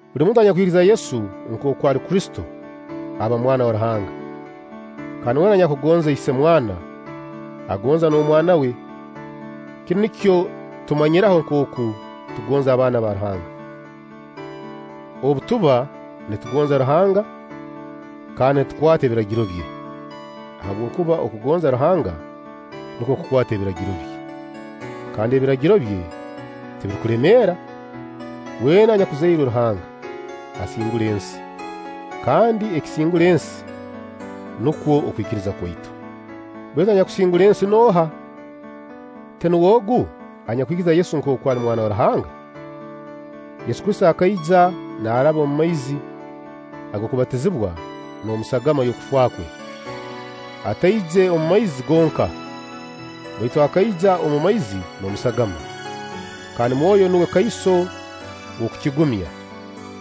Buli muntu anyakwikiriza Yesu nkooku ali Kristo, aba mwana wa Ruhanga; kandi weena anyakugonza Isemwana, agonza n'omwana we. Kinu nikyo tumanyiraho nkooku tugonza abaana ba Ruhanga: obu tuba nitugonza Ruhanga kandi nitukwata ebiragiro bye. Habwokuba okugonza Ruhanga nukwo kukwata ebiragiro bye. Kandi ebiragiro bye tibirukulemeera. Weena anyakuzairwe Ruhanga asingura ensi, kandi ekisingura ensi nukwo okwikiriza kwaitu. Baitu anyakusingura ensi nooha? Tinuwe ogu anyakwikiriza Yesu nkooku ali Mwana wa Ruhanga? Yesu Kristo akaija naaraba omu maizi ag'okubatizibwa n'omu sagama y'okufa kwe. Ataije omu maizi gonka, baitu akaija omu maizi n'omu sagama. Kandi Mwoyo nuwe kaiso w'okukigumya,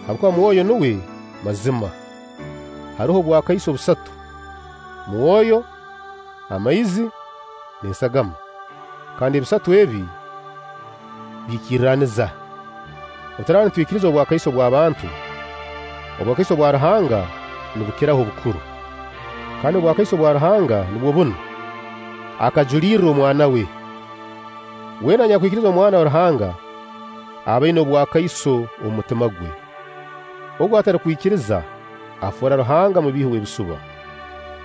habwokuba Mwoyo nuwe mazima. Haroho obwakaiso busatu: Mwoyo, amaizi, n'esagama; kandi ebisatu ebi biikirraniza. Obu turaaba nitwikiriza obwakaiso bwa bantu, obwakaiso bwa Ruhanga nibukiraho obukuru; kandi obwakaiso bwa Ruhanga nubwo bunu: akajuliirra Omwana we. Weena anyakwikiriza Omwana wa Ruhanga, aba aina obwakaiso omu mutima gwe. Ogu atarukwikiriza, afoora Ruhanga mubiihi w'ebisuba,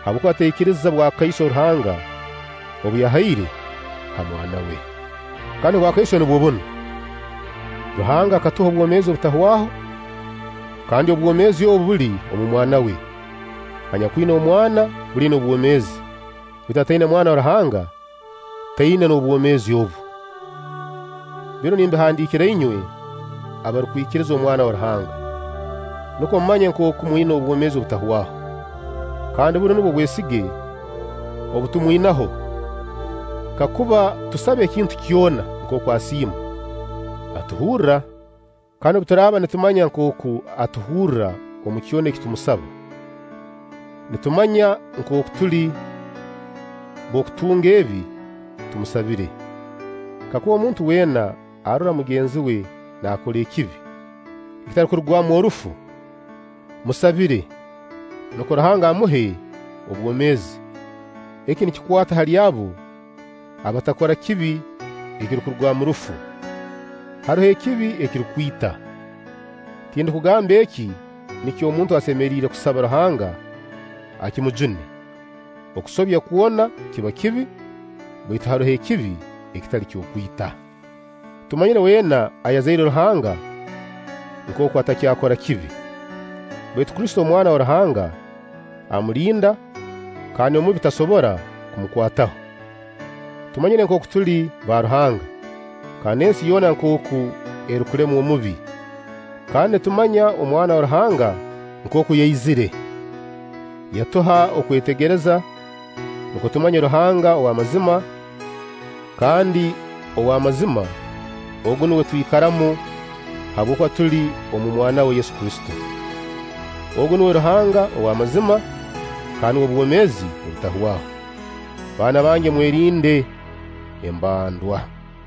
habwokuba taikiriza bwakaiso Ruhanga obu yahaire ha Mwana we. Kandi obwakaiso nubwo bunu: Ruhanga akatuha obwomeezi obutahwaho, kandi obwomeezi obu buli omu Mwana we. Anyakwina Mwana buli aina obwomeezi; baitu ataina Mwana wa Ruhanga taina n'obwomeezi obu. Binu nimbihandiikira inywe abarukwikiriza Omwana wa Ruhanga, nukwo mumanye nkooku mwina obwomeezi obutahwaho. Kandi bunu nubwo bwesige obu tumwinaho: kakuba tusaba ekintu kyona nkooku asiima, atuhurra. Kandi obu turaaba nitumanya nkooku atuhurra omu kyona eki tumusaba, nitumanya nkooku tuli b'okutunga ebi tumusabire. Kakuba omuntu weena arora mugenzi we naakora ekibi ekitarukurugwamu orufu, amusabire, nukwo Ruhanga amuhe obwomeezi. Eki nikikwata hali abo abatakora kibi ekirukurugwamu rufu. Haroho ekibi ekirukwita; tindukugamba eki nikyo omuntu asemeriire kusaba Ruhanga akimujune. Okusobya kwona kiba kibi, baitu haroho ekibi ekitali ky'okwita. Tumanyire weena ayazairwe Ruhanga nkooku atakyakora kibi; baitu Kristo, Omwana wa Ruhanga, amulinda kandi Omubi tasobora kumukwataho. Tumanyire nkooku tuli ba Ruhanga, kandi ensi yoona nkooku erukulemwa Omubi. Kandi nitumanya Omwana wa Ruhanga nkooku yaizire, yatuha okwetegereza nukwo tumanye Ruhanga owamazima; kandi ow'amazima; Ogu nuwe twikaramu habwokuba tuli omu Mwana we Yesu Kristo. Ogu nuwe Ruhanga ow'amazima, kandi nuwe bwomeezi obutahwaho. Baana bange, mwerinde embandwa.